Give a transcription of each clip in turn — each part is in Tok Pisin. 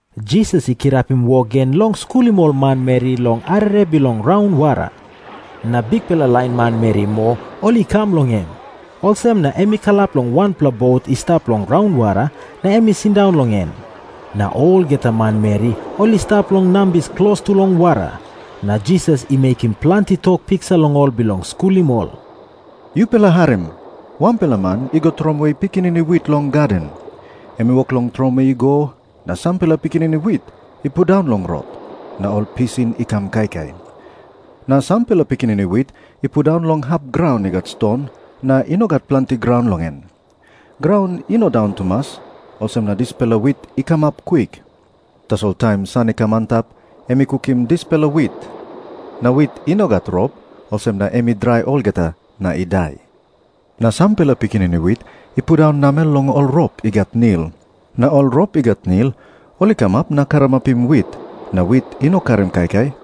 Jisas i kirapim wok gen long skulim ol manmeri long arere bilong raunwara. Na bikpela lain manmeri moa ol i kam long em. Olsem na em i kalap long wanpela bot i stap long raunwara, na em i sindaun long en. Na olgeta manmeri ol i stap long nambis klostu long wara. Na Jisas i mekim planti tok piksa long ol bilong skulim ol. "Yupela harim. Wanpela man i go tromoi pikinini wit long gaden. Em i wok long tromoi i go, na sampela pikinini wit i pundaun long rot, na ol pisin i kam kaikai. Na sampela pikinini wit i pundaun long hap graun i gat ston, na i no gat planti graun long en. Graun i no daun tumas, olsem na dispela wit i kamap kwik. Tasol taim san i kam antap em i kukim dispela wit. Na wit i no gat rop, olsem na em i drai olgeta, na i dai. Na sampela pikinini wit i pundaun namel long ol rop i gat nil. Na ol rop i gat nil ol i kamap na karamapim wit, na wit i no karim kaikai.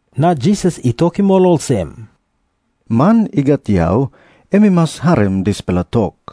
Na Jisas i tokim ol olsem, "Man i gat yau em i mas harim dispela tok."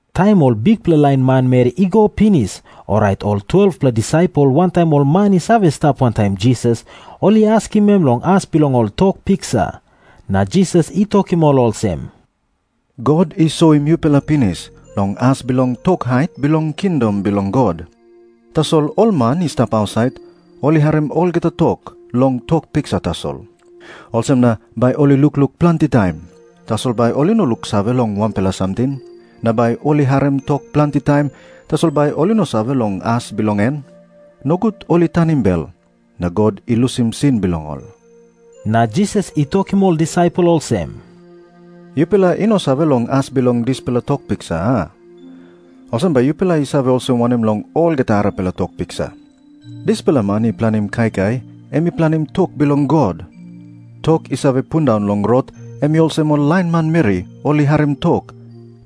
Taim ol bikpela lain manmeri i go pinis, orait ol 12-pela disaipel wantaim ol man i save stap wantaim Jisas, ol i askim em long as bilong ol tok piksa. Na Jisas i tokim ol olsem, "God i soim yupela pinis long as bilong tok hait bilong kingdom bilong God. Tasol ol man i stap ausait, ol i harim olgeta tok long tok piksa tasol. Olsem na 'Bai ol i lukluk planti taim, tasol bai ol i no luksave long wanpela samting. Na bai ol i harim tok planti taim, tasol bai ol i no save long as bilong en, nogut ol i tanim bel, na God i lusim sin bilong ol.'" Na Jisas i tokim ol disaipel olsem, "Yupela i no save long as bilong dispela tok piksa, a? Olsem bai yupela i save olsem wanem long olgeta arapela tok piksa? Dispela man i planim kaikai em i planim tok bilong God. Tok i save pundaun long rot em i olsem ol lain manmeri ol i harim tok,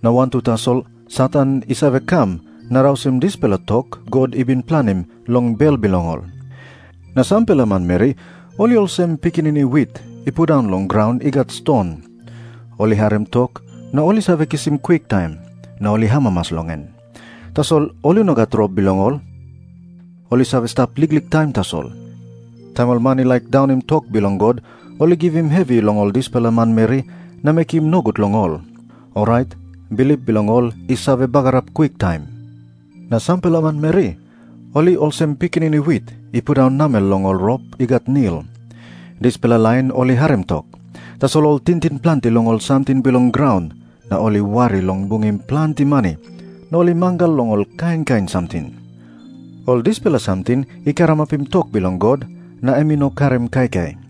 na wantu tasol Satan i save kam na rausim dispela tok God i bin planim long bel bilong ol. Na sampela manmeri ol i olsem pikinini wit i pundaun long graun i gat ston. Ol i harim tok, na ol i save kisim kwiktaim, na ol i amamas long en. Tasol ol i no gat rop bilong ol. Ol i save stap liklik taim tasol. Taim ol man i laik daunim tok bilong God ol i givim hevi long ol dispela manmeri na mekim nogut long ol, orait bilip bilong ol i save bagarap kwiktaim. Na sampela manmeri ol i olsem pikinini wit i pundaun namel long ol rop i gat nil. Dispela lain ol i harim tok, tasol ol i tingting planti long ol samting bilong graun na ol i wari long bungim planti mani na ol i mangal long ol kain kain samting. Ol dispela samting i karamapim tok bilong God, na em i no karim kaikai.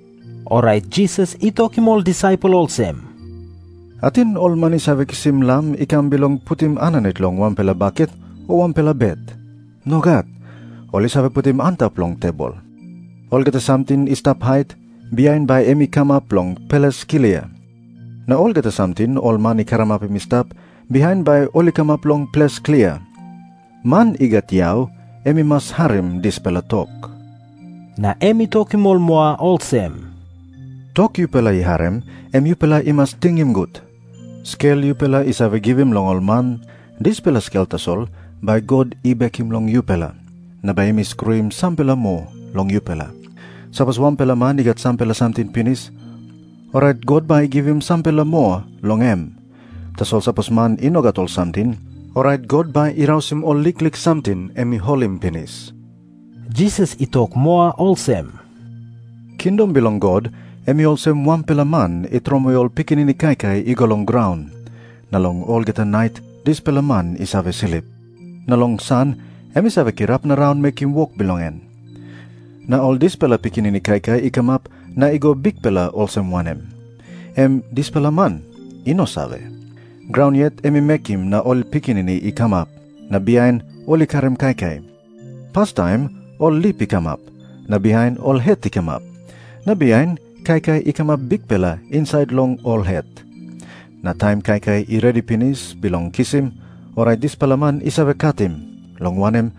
Orait Jisas i tokim ol disaipel olsem, "Ating ol man i save kisim lam i kam bilong putim aninit long wanpela baket o wanpela bet? Nogat. Ol i save putim antap long tebol. Olgeta samting i stap hait, bihain bai em i kamap long ples klia. Na olgeta samting ol man i karamapim i stap, bihain bai ol i kamap long ples klia. Man i gat yau em i mas harim dispela tok." Na em i tokim ol moa olsem, "Tok yupela i harim, em yupela i mas tingim gut. Skel yupela i save givim long ol man, dispela skel tasol bai God i bekim long yupela. Na bai em i skruim sampela moa long yupela. Sapos wanpela man i gat sampela samting pinis, orait God bai i givim sampela moa long em. Tasol sapos man i no gat ol samting, orait God bai i tekewe ol liklik samting em i holim pinis." Jisas i tok moa olsem, "Kingdom bilong God em i olsem wanpela man i tromoi ol pikinini kaikai i go long graun. Na long olgeta nait dispela man i save slip, na long san em i save kirap na raun mekim wok bilong en. Na ol dispela pikinini kaikai i kamap na i go bikpela olsem wanem, em dispela man i no save. Graun yet em i mekim na ol pikinini i kamap, na bihain ol i karim kaikai. Pastaim ol lip i kamap, na bihain ol het i kamap, na bihain kaikai i kamap bikpela insait long ol het. Na taim kaikai i redi pinis bilong kisim, orait dispela man i save katim, long wanem,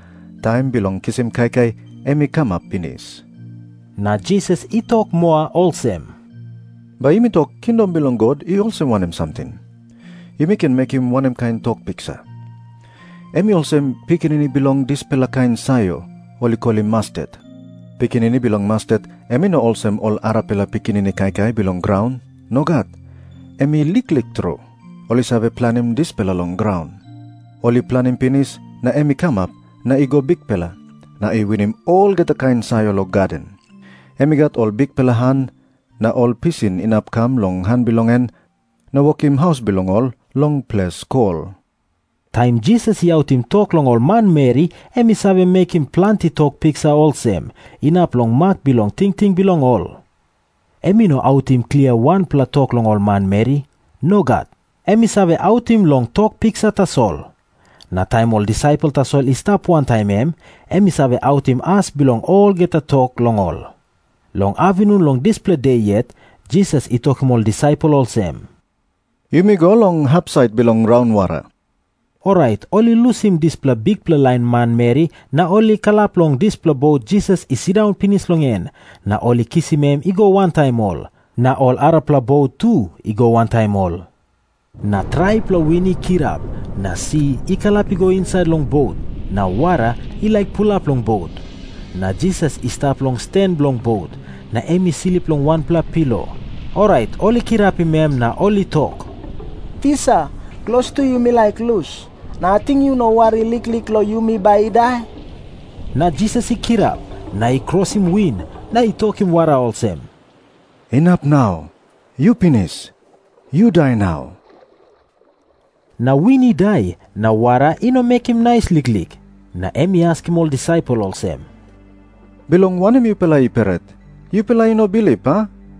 taim bilong kisim kaikai em i kamap pinis." Na Jisas i tok moa olsem, "Bai yumi tok, kingdom bilong God i olsem wanem samting? Yumi ken mekim wanem kain tok piksa? Em i olsem pikinini bilong dispela kain sayor ol i kolim mastet. Pikinini bilong mastet em i no olsem ol arapela pikinini kaikai bilong graun. Nogat. Em i liklik tru. Ol i save planim dispela long graun. Ol i planim pinis, na em i kamap na i go bikpela, na i winim olgeta kain sayor long gaden. Em i gat ol bikpela han, na ol pisin inap i kam long ol han bilong en na wokim haus bilong ol long ples kol." Taim Jisas i autim tok long ol manmeri em i save mekim planti tok piksa olsem, inap long mak bilong tingting bilong ol. Em i no autim klia wanpela tok long ol manmeri. Nogat. Em i save autim long tok piksa tasol. Na taim ol disaipel tasol i stap wantaim em, em i save autim as bilong olgeta tok long ol. Long apinun long dispela de yet, Jisas i tokim ol disaipel olsem, "Yumi go long hapsait bilong raunwara." Orait ol i lusim dispela bikpela lain manmeri na ol i kalap long dispela bot Jisas I sindaun pinis long en, na ol i kisim em i go wantaim ol. Na ol arapela bot tu i go wantaim ol. Na traipela win i kirap, na si i kalap I go insait long bot, na wara i laik pulap long bot. Na Jisas I stap long stan bilong bot, na em i slip long wanpela pilo. Orait ol I kirapim em na ol i tok, "Tisa, klostu yumi laik lus, na ating yu no wari liklik long yumi bai i dai?" Na Jisas i kirap, na i krosim win, na i tokim wara olsem, "Inap nau. Yu pinis! Yu dai nau!" Na win I dai, na wara i no mekim nais liklik. Na em i askim ol disaipel olsem, "Bilong wanem yupela i pret? Yupela i no bilip, a?"